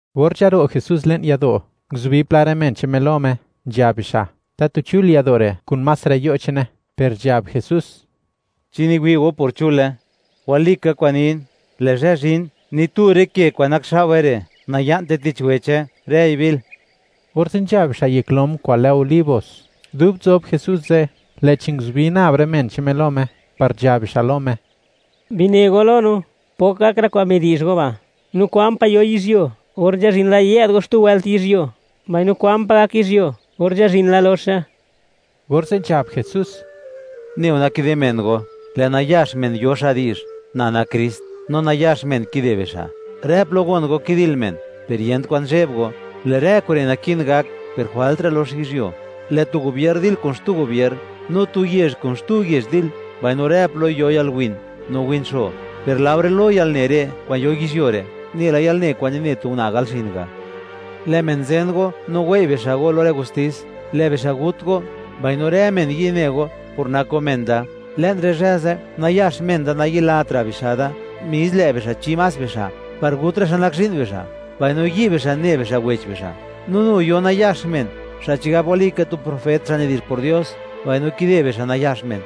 Or nzharo' Jesús le'n yado', nguzubi pla rë men che'n Me lo Me, nzhab bixa', tatu chul yado' re', kun más rë yo' che'ne, per nzhab Jesús: ―¿Chi niwi' go por chule? Walika kwa'n nin, lë' zhë zhin, ni tu rë ke kwa'n nakxao'we re', naya'nte tich weche; rëi bil. Or nzha bixa' yek lom kwa'n lë Olivos, dub nzob Jesús ze', lë'chi nguzubi nab rë men che'n Me lo Me, par nzhab bixa' lo Me: ―Bine go lo no, ¿pok gak rë kwa'n midi'zh go ba'?, no, ¿kwan pa' yo yizhyuo or nzhazhin la yë'd go xtu wëlt yizhyuo?, mbaino, ¿kwan pa' gak yizhyuo or nzhazhin la loxe? Orze' nzhab Jesús: ―Neu nakide men go, lë' nayax men yo xa' di'zh: “Na nak Krist”, no nayax men kide bixa'. Rë plo gon go kidil men, per yent kwan zheb go, lë' rë kure' naki'n gak per jwalt ra' lox yizhyuo. Lë' tu gubier dil kun xtu gubier, no tu yezh kun xtu yezh dil, mbaino rë plo yo yalwin no win xo. Per laore lo yalne re', kwa'n yo yizhyuo re', nela yalne kwa'n nine tu una' gal xin ga'. ’Lë' men zen go no wei' bixa' go lo rë gustis; lë' bixa' gut go, mbaino rë men yi' ne go por nak go men da. Le'n rë zhë ze', nayax men da nayilat ra' bixa' da, mis lë' bixa' chi más bixa' par gut rë xa' nak zhi'n bixa', mbaino yi' bixa' ne bixa' wech bixa'. No nu yo nayax men, xa' chigab walika tu profet xa' nidi'zh por Dios, mbaino kide bixa' nayax men.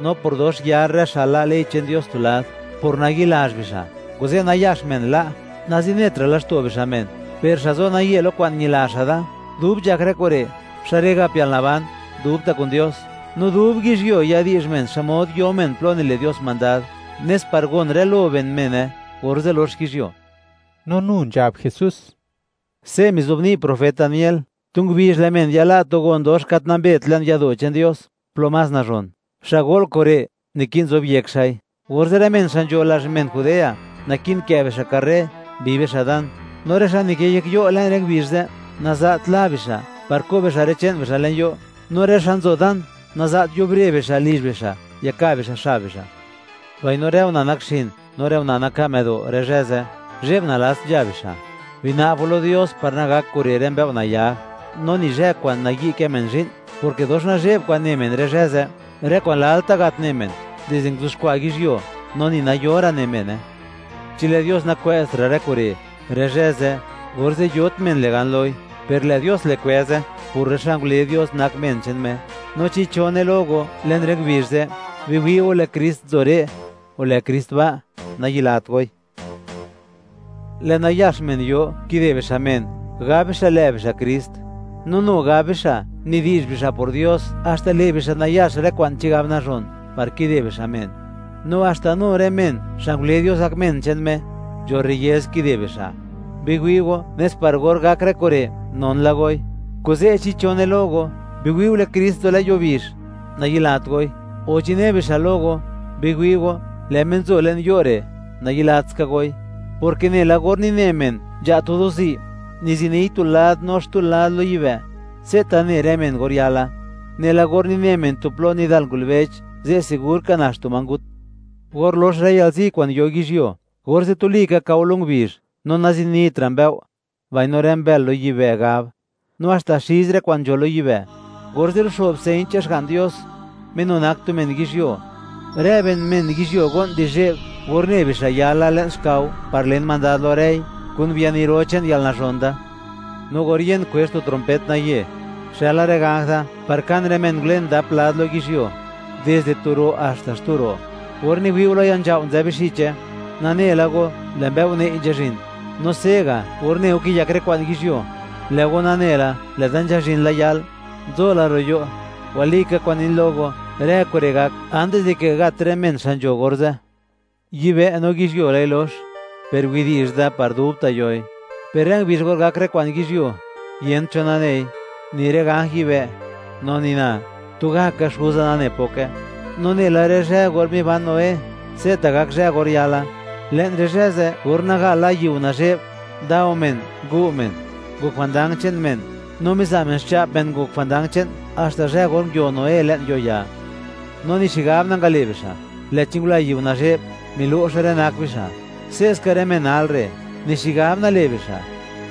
No por dox yar rë xa' la' ley che'n Dios tu lad, por nayi'lazh bixa', kuze' nayax men la' nazinet ra' laxto' bixa' men. Per xa' zo naye lo kwa'n ñila xa' Da dub nzhak rë kure', xa' re' gap yalnaban dubta' kun Dios, no dub yizhyuo, yadi'zh men xmod yo men plo nile' Dios mandad, nes par gon rë lo ben mene, orze' lox yizhyuo. No nu nzhab Jesús: —Se' mizobni' profet Daniel. Tu ngubizh lë' men yala' tu gon dox gat nambet le'n yado' che'n Dios plo más nazhon. Xa' go'l kure' naki'n zobyek xa'i. Orze' rë men xa' nzho lazh men Judea, naki'n kë' bixa' karre, bi bixa' dan, no rë xa' nikë yek yo' le'n rë ngubizh ze', naza't la bixa' par ko' bixa' rë che'n bixa' le'n yo'; no rë xa' nzo dan, naza't yubre bixa' lizh bixa' yaka' bixa' xab bixa'; mbaino rë una' nakxin no rë una' naka' më'do' rë zhë ze', zhe'b nalats nzha bixa'. Bina'b go lo Dios par nagak kure' rë mbëo' nayag, no ni zhë kwa'n nayi' kë men zhi'n, porke dox nazhe'b kwa'n ne men rë zhë ze', rë kwa'n lalta' nagat ne men dizde nguiuxkwa' yizhyuo, no ni nayora' ne mene. Chi lë' Dios nakwë'zt ra' rë kure', rë zhë ze', orze' yot men le' gan loi; per lë' Dios le' kwë'ze, por rë xa' ngule Dios, nak men che'n Me. ’No chi cho ne lo go, le'n rë ngubizh ze': “Biwi' go; lë' Krist nzo re'”, o “Lë' Krist ba'”, nayilat goi. Lë' nayax men yo, kide bixa' men, gab bixa' lë' bixa' Krist, no nu gab bixa', nidi'zh bixa' por Dios; haxta le' bixa' nayax rë kwa'n chigab nazhon par kide bixa' men, no haxta nu rë men xa' ngule Dios gak men che'n Me, nzho rriez kide bixa'. Biwi' go, nes par or gak rë kure', non la goi (nane la goi). Kuze', chi cho ne lo go: “Biwi'u, lë' Krist nzo le'n yuo bizh”, nayilat goi; o chi ne bixa' lo go: “Biwi' go, lë' Me nzo le'n yo' re'”, nayilat ska goi, porke nela or nine men nzha' tu do'zi', niziniy tu lad no xtu lad lo yibë', se'ta' ne rë men or yala. Nela or nine men tu plo nidal ngulbech, ze' sigur ka nax tu ma ngut. ’Or lox rë yalzi kwa'n yo yizhyuo, orze' tuli ka kao lo ngubizh, no nazinit ra' mbëo', mbaino rë mbël lo yibë' gab; no haxta xiz rë kwa'n nzho lo yibë'. Orze' luxo'b señ che'n Xga'n Dios Me nu nak tu men yizhyuo, rë ben men yizhyuo go'n di zheb or ne bixa' yala le'n xkao par len mandad lo rëi, kun biani ro che'n yalnazhon da. No or yen kwezh tu trompet nayë, xëla rë ganj Da par kan rë men ngulen dap lad lo yizhyuo, dizde tu ro' haxta xtu ro'. ’Or niwi' go lo ya nzhao' nzë bixiche, nane la go, lë' mbëo' nëi' nzhazhin. No se'ga', or ne go kiyak rë kwa'n yizhyuo; lë' go nane la, lë'da nzhazhin la yal; nzo la ro' yo'. Walika kwa'n nin lo go, rë kure' gak antis dike gat rë men xa' nzho orze'. Yibë' no yizhyuo lë'i lox; per widi'zh da, par dubta' yoi. Per rë ngubizh or gak rë kwa'n yizhyuo, yent cho nanei; ni rë ganj yibë', no ni Na; tugaka Xuza nane poke. ’No nela rë zhë or miban Noé, se'ta' gak zhë or yala. Le'n rë zhë ze', or naga la yiu nazhe'b, ndao men, ngu' men, ngok jwandang che'n men, no miza' men xcha'p men ngok jwandang che'n haxta zhë or nguio Noé le'n yo'ya, no ni xigab nangale' bixa', lë'chi ngula yiu nazhe'b, milo'xe rë nak bixa'; se'ska rë men nal re', ni xigab nale' bixa',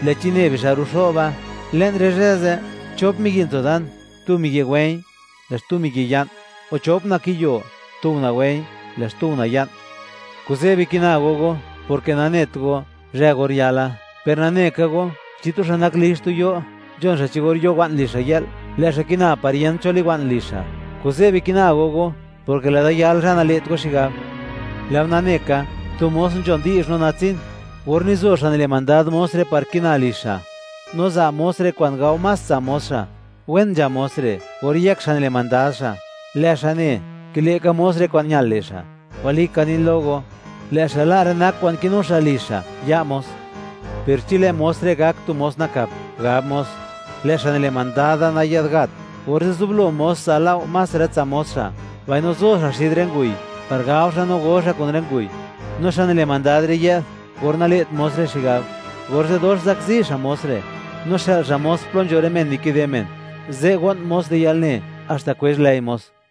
lë'chi ne bixa' ruxo'ba. Le'n rë zhë ze', chop miyi' nzo dan; tu miyi' wë̱i̱ñ, lë' xtu miyi' ya'n; o chop una' kiyo; tu una' wë̱i̱ñ, lë' xtu una' ya'n. ’Kuze' bikina go go, porke nanet go, zhë or yala. Per nane ka go, chi tu xa' nak lizh tu yo', nzhon xa' cho or yo wa'n lizh xa' yë'l, lë' xa' kina par yent cho liwa'n lizh xa'. Kuze' bikina go go, porke lë'da yal zhë nale't go xigab. ’Lë' go nane ka, tu mos nzhon di'zh no natsin; or nizo xa' nile' mandad mos re' par kina lizh xa', no za' mos re' kwa'n gao más tsa' mos xa', wen nzha mos re', or yëk xa' nile' mandad xa', lë' xa' ne, kile' ka mos re' kwa'n ñal le' xa'. Walika nin lo go, lë' xa' la' rë nak kwa'n kinu xa' lizh xa' ya' mos. Per chi lë' mos re' gak tu mos nakap, gab mos: “Lë' xa' nile' mandad da nayë'd gat”, orze' zublo mos za' lao' más rë tsa' mos xa', mbaino zo xa' xid rë nguy par gao xa' no go xa' kun rë nguy, no xa' nile' mandad ze' yë'd or nale't mos re' xigab, orze' dox zakzi xa' mos re', no xë'l xa' mos plo nzho rë men nikide men; ze' go'n mos di yalne, haxta kwezh lëi mos.